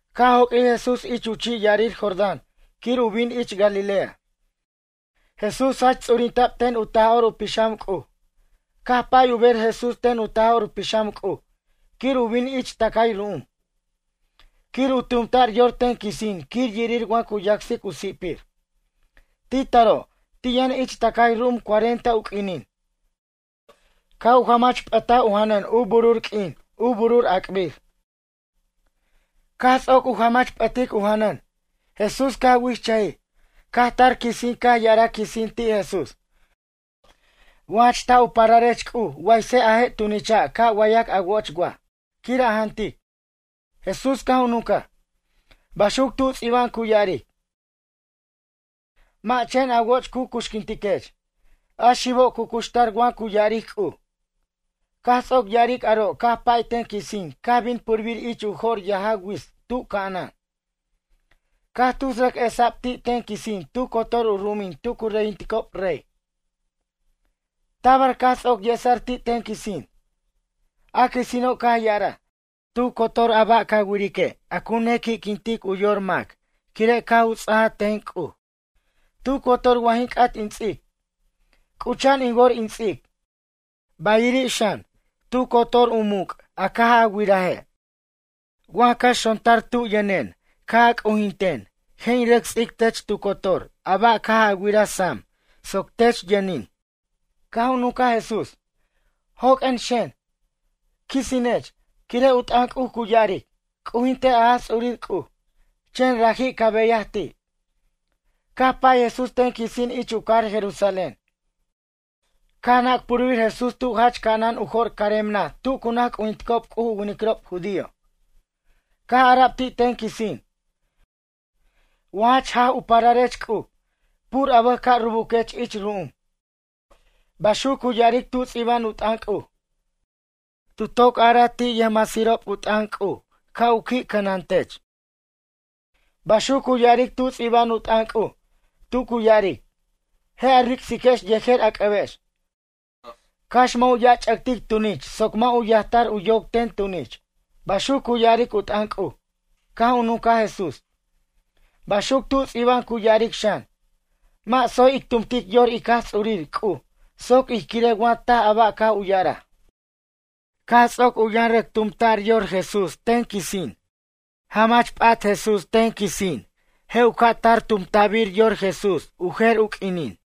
Caj joq'uij Jesús ich u chi' ya'arir Jordán quir u bin ich Galilea, Jesús jach ts'urinta'b ten u Taj'or u Pixam C'uj. Caj pay u ber Jesús ten u Taj'or u Pixam C'uj quir u bin ich tʌcay ru'um. Quir u tumta'r yor ten quisin quir yirir wa cu yacsic u si'pir. Ti' taro', ti' yʌn ich tʌcay ru'um cuarenta u q'uinin. Caj u jamach p'ʌtaj u janʌn u burur q'uin, u burur ac'bir. Caj ts'oc u jamach p'ʌtic u janʌn, Jesús caj wichʌjij. Caj tar quisin caj ya'araj quisin ti' Jesús: ―Wa jach taj u pararech C'uj waysej a je' tunicha' ca' wayac a woch waj, quir a jantic. Jesús caj u nuncaj: ―Baxuc tu ts'iba'an cu ya'aric: “Mʌ' chen a woch cu cuxquintiquech. A xibo' cu cuxtar wa cu ya'aric C'uj.” Caj ts'oc ya'aric aro' caj pay ten quisin caj bin purbir ich jo'r yajaw wits tu ca'anan. Caj tus rʌc esa'b ti' ten quisin tu cotor u ru'umin tu cu reyinticob rey. Tabar caj ts'oc yesa'r ti' ten quisin. A quisino' caj ya'araj: ―Tu cotor a ba' ca wirique' a cu nequi'quintic u yor mac quire' caj u ts'aj ten C'uj, tu cotor wa jin c'at in ts'ic, c'ucha'an in wor in ts'ic. Bayiri' xan, tu cotor u muc' a caj a wiraje'. Wa ca xontar tub yʌnen ca' a c'ujinten je' in rʌc ts'ic tech tu cotor a ba' caj a wiraj sam, soc tech yʌnin. Caj u nuncaj Jesús: ―Joq'uen xen, Quisinech. Quire' u t'ʌn C'uj cu ya'aric: “C'ujintej a Jaj Ts'urir C'uj. Chen raji' ca beyaj ti'.” Caj pay Jesús ten quisin ich u cajar Jerusalén. Caj nac purbir Jesús tu jach ca'anan u jo'r carem naj tu cu naj c'ujinticob C'uj u winiquirob judío. Caj ara'b ti' ten quisin: ―Wa jach jaj u pararech C'uj, pur a bʌj ca' rubuquech ich ru'um. Baxuc cu ya'aric tu ts'iba'an u t'ʌn C'uj: Tu toc araj ti' yʌjmasirob u t'ʌn C'uj ca' u qui' cʌnatech. Baxuc cu ya'aric tu ts'iba'an u t'ʌn C'uj, tu cu ya'aric: “Je' a ric'siquex yejer a c'ʌbex, cax mʌ' u ya' ch'ʌtic tunich soc mʌ' u yajtar u yoc ten tunich.” Baxuc cu ya'aric u t'ʌn C'uj. Caj u nuncaj Jesús: ―Baxuc tu ts'iba'an cu ya'aric xan: “Mʌ' tsoy ic tumtic yor ic Jaj Ts'urir C'uj soc ij quirej wa taj a ba' caj u ya'araj.” Caj ts'oc u yʌn rʌc tumta'r yor Jesús ten quisin. Jamach p'at Jesús ten quisin je' u ca'tar tumta'bir yor Jesús u jer u q'uinin.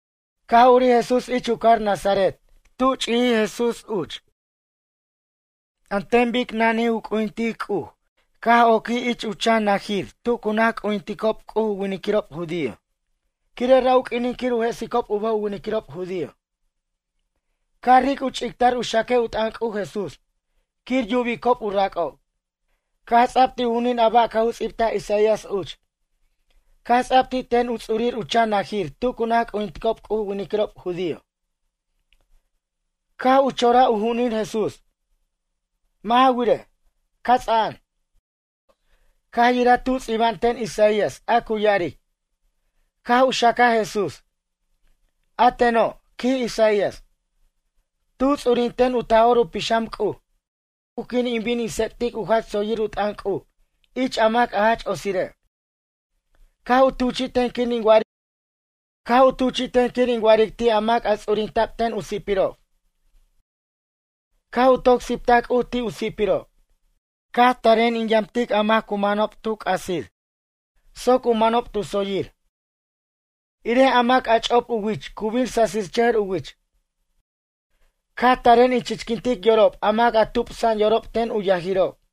Caj urij Jesús ich u cajar Nazaret tub ch'ijij Jesús uch. An ten bic nanij u c'ujintic C'uj caj oquij ich u chan najir tu cu naj c'ujinticob C'uj u winiquirob judío. Quire' ra' u q'uinin quir u jesicob u bʌj u winiquirob judío. Caj ric' u ch'ictar u xaquej u t'ʌn C'uj Jesús quir yubicob u rac'ob. Caj ts'a'b ti' u ju'unin a ba' caj u ts'ibtaj Isaías uch. Caj ts'a'b ti' ten u ts'urir u chan najir tu cu naj c'ujinticob C'uj u winiquirob judío. Caj u choraj u ju'unin Jesús, mʌ' ja wirej, cats'a'an. Caj yiraj tu ts'iba'an ten Isaías a cu ya'aric, caj u xacaj Jesús: A teno', quij Isaías, tu ts'urinten u Taj'or u Pixam C'uj. Rajen caj u teten C'uj quir in bin in tsec'tic u jach tsoyir u t'ʌn C'uj ich a mac jach otsire'. Caj u tuchi'ten quir in wa'aric ti' a mac ts'urinta'b ten u si'pirob, caj u toc siptaj C'uj ti' u si'pirob. Caj aren in yamtic a mac cu manob tu c'asir soc u manob tu tsoyir, irej a mac ch'op u wich cu bin sasichʌjʌr u wich. Caj taren in chichquintic yorob a mac tupsa'an yorob ten u yajirob.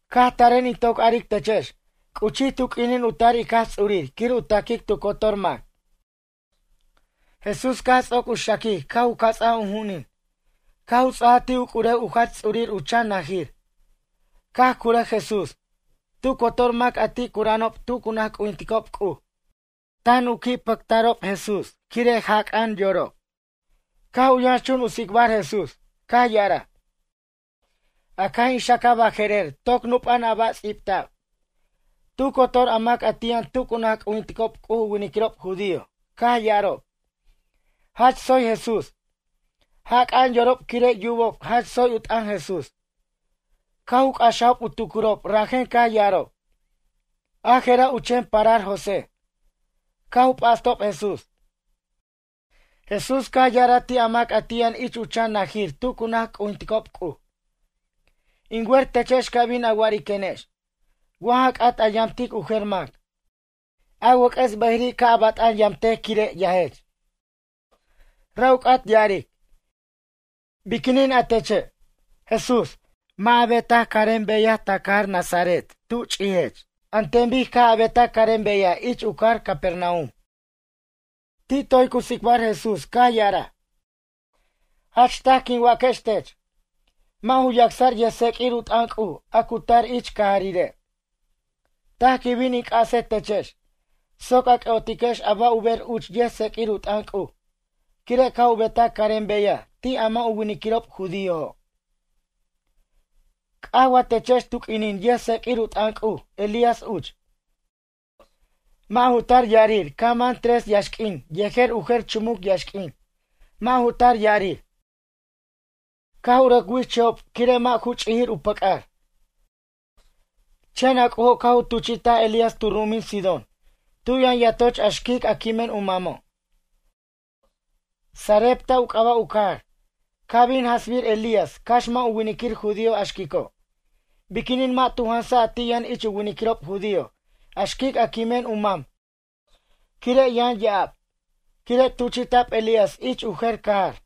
Caj taren in toc aric techex c'uchij tu q'uinin u tar ic Jaj Ts'urir quir u ta'quic tu cotor mac. Jesús caj ts'oc u xaquic caj u ca' cats'aj u ju'unin caj u ts'aj ti' u c'urew u jach ts'urir u chan najir. Caj cura Jesús. Tu cotor mac a ti' cura'anob tu cu naj c'ujinticob C'uj tan u qui' pʌta'rob Jesús quire' jac'a'an yorob. Caj u yʌnxchun u tsicbar Jesús, caj ya'araj: ―A caj in xacaj baje'rer toc nup'a'an a ba' ts'ibta'b. Tu cotor a mac ti' yʌn tu cu naj c'ujinticob C'uj u winiquirob judío caj ya'arob: ―Jach tsoy Jesús. Jac'a'an yorob quire' yubob jach tsoy u t'ʌn Jesús. Caj u c'axajob u tucurob rajen caj ya'arob: ―A je'ra' u chen parar José. Caj u p'astob Jesús. Jesús caj ya'araj ti' a mac a ti' yʌn ich u chan najir tu cu naj c'ujinticob C'uj: ―In wer techex ca' bin a wa'ariquenex: “Wa ja c'at a yamtic u jer mac, a wʌc'ʌs bʌjiri' ca' a bat'an yamtej quire' yajech.” Ra' u c'at ya'aric: “Biquinin a teche', Jesús, mʌ' a betaj carem beyaj ta cajar Nazaret tu chi'jech an ten bic caj a betaj carem beyaj ich u cajar Capernaum?” Ti' toy cu tsicbar Jesús caj ya'araj: ―Jach taj quin waquex tech. Mʌ' ju yacsʌr yʌjtseq'uir u t'ʌn C'uj a cu tar ich cajarire'. Taj quin bin in c'asej techex, soc a c'ʌ'otiquex ba' u ber uch yʌjtseq'uir u t'ʌn C'uj, quire' caj u betaj carem beyaj ti' a mʌ' u winiquirob judíojo'. C'aj wa techex tu q'uinin yʌjtseq'uir u t'ʌn C'uj Elías uch. Mʌ' ju tar ya'arir caj mʌn tres yaxq'uin yejer u jer chumuc yaxq'uin. Mʌ' ju tar ya'arir, caj u rʌc wichʌjob quire' mʌ' ju ch'ijir u pʌc'ar. Chen a C'ujo' caj u tuchi'taj Elías tu ru'umin Sidón tu yʌn yatoch a xquic a quimen u mamo'. Sarepta u c'aba' u cajar. Caj bin jansbir Elías cax mʌ' u winiquir judío a xquico'. Biquinin mʌ' tu jansaj a ti' yʌn ich u winiquirob judío a xquic a quimen u mam quire' yʌn ya'ab? Quire' tuchi'ta'b Elías ich u jer cajar.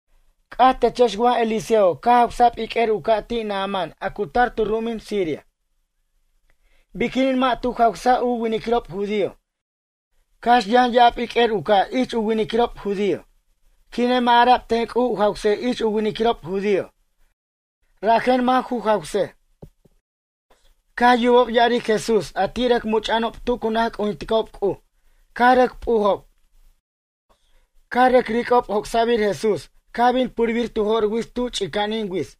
C'ajtechex wa Eliseo caj jawsa'b iq'uer u ca' ti' Naamán a cu tar tu ru'umin Siria. Biquinin mʌ' tu jawsaj u winiquirob judío cax yʌn ya'ab iq'uer u ca' ich u winiquirob judío? Quire' mʌ' ara'b ten C'uj u jawsej ich u winiquirob judío, rajen mʌ' ju jawsej. Caj yubob ya'aric Jesús a ti' rʌc much'a'anob tu cu naj c'ujinticob C'uj caj rʌc p'ujob. Caj rʌc ric'ob joc'sa'bir Jesús caj bin purbir tu jo'r wits tu ch'ica'anin wits.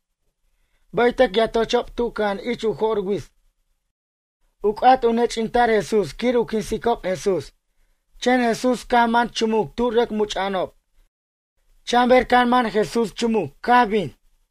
Bʌytʌc yatochob tu cʌja'an ich u j'or wits. U c'at u nech'inta'r Jesús quir u quinsicob Jesús. Chen Jesús caj man chumuc tu rʌc much'a'anob, chan ber caj man Jesús chumuc caj bin.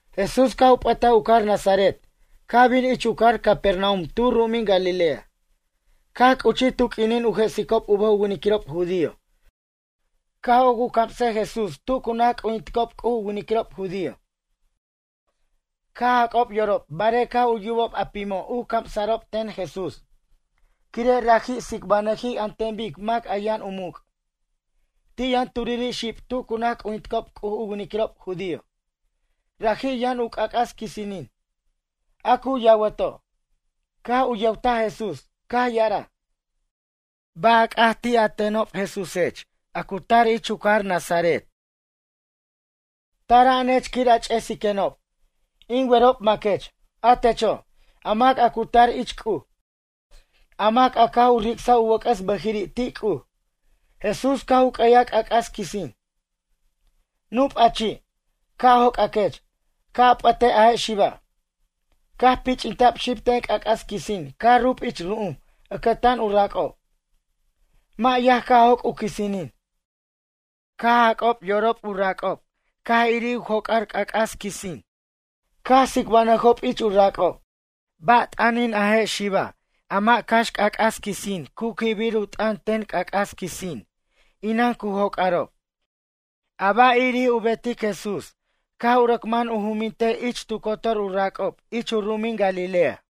Jesús caj u p'ʌtaj u cajar Nazaret caj bin ich u cajar Capernaum tu ru'umin Galilea. Caj c'uchij tu q'uinin u jesicob u bʌj u winiquirob judío caj oc u camsej Jesús tu cu naj c'ujinticob C'uj u winiquirob judío. Caj jac'ob u yorob barej caj u yubob a pimo' u camsa'rob ten Jesús, quire' raji' tsicbanʌjij an ten bic mac a yʌn u muc'. Ti' yʌn turiri' xib tu cu naj c'ujinticob C'uj u winiquirob judío. Raji' yʌn u c'ac'as quisinin, a cu yawato'. Caj u yʌwtaj Jesús, caj ya'araj: ―Ay, ba' a c'at ti' a tenob, Jesúsech, a cu tar ich u cajar Nazaret? Tara'anech quir a ch'esiquenob? In werob maquech, a techo', a mac a cu tar ich C'uj, a mac a caj u ric'saj u wʌc'ʌs bʌjiri' ti' C'uj. Jesús caj u q'ueyaj c'ac'as quisin: ―Nup' a chi', ca' joc'aquech, ca' a p'ʌtej a je' xiba'. Caj pich'inta'b xib ten c'ac'as quisin caj rub ich ru'um ʌcʌtan u rac'ob. Mʌ' yaj caj joc' u quisinin. Caj jac'ob yorob u rac'ob caj irir u joc'ar c'ac'as quisin. Caj tsicbanʌjob ich u rac'ob: ―Ba' t'ʌnin a je' xiba' a mʌ' cax c'ac'as quisin cu quibir u t'ʌn ten c'ac'as quisin? Inan cu joc'arob. A ba' irir u betic Jesús caj u rʌc man u jumintej ich tu cotor u rac'ob ich u ru'umin Galilea.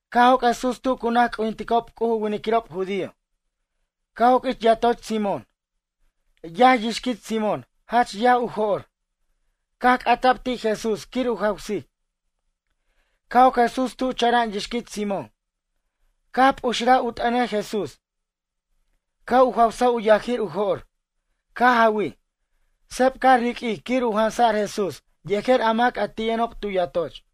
Caj joc' Jesús tu cu naj c'ujinticob C'uj u winiquirob judío, caj oc ich yatoch Simón. Yaj yixquit Simón, jach ar u jo'r. Caj c'ata'b ti' Jesús quir u jawsic. Caj oc Jesús tu chara'an yixquit Simón. Caj p'uxraj u t'ʌnej Jesús, caj u jawsa u yajir u jo'r. Caj jawij, seb caj riq'uij quir u jansa'r Jesús yejer a mac a ti' yʌnob tu yatoch.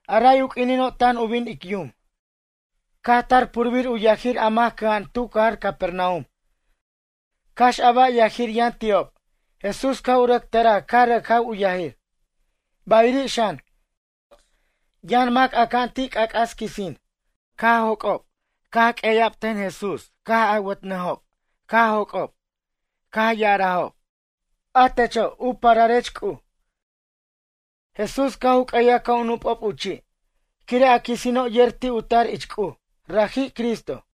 A ray u q'uinino' tan u bin ic yum, caj tar purbir u yajir a mac cʌja'an tu cajar Capernaum cax a ba' yajir yʌn ti'ob Jesús caj u rʌc tʌraj caj rʌc jaw u yajir. Bayiri' xan, yʌn mac aca'an ti' c'ac'as quisin. Caj joc'ob, caj q'ueya'b ten Jesús caj awʌtnʌjob caj joc'ob, caj ya'arajob: ―A techo', u pararech C'uj. Jesús caj u q'ueyaj ca' u nup'ob u chi' quire' a quisino' yer ti' u tar ich C'uj, rajij Cristo.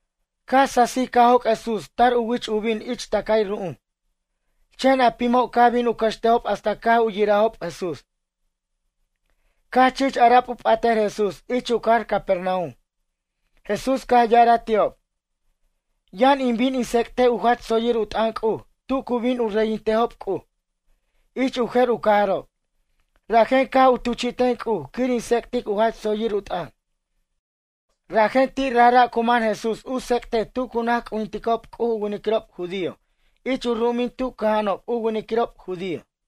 Caj sasij caj joc' Jesús tar u wich u bin ich tacay ru'um. Chen a pimo' caj bin u cʌxtejob hasta caj u yirajob Jesús. Caj chich ara'b u p'atʌr Jesús ich u cajar Capernaum. Jesús caj ya'araj ti'ob: ―Yʌn in bin in tsec'tej u jach tsoyir u t'ʌn C'uj tu cu bin u reyintejob C'uj, ich u jer u cajarob. Rajen caj u tuchi'ten C'uj quir in tsec'tic u jach tsoyir u t'ʌn. Rajen ti' rajra' cu man Jesús u tsec'tej tu cu naj c'ujinticob C'uj u winiquirob judío ich u ru'umin tu cʌja'anob u winiquirob judío.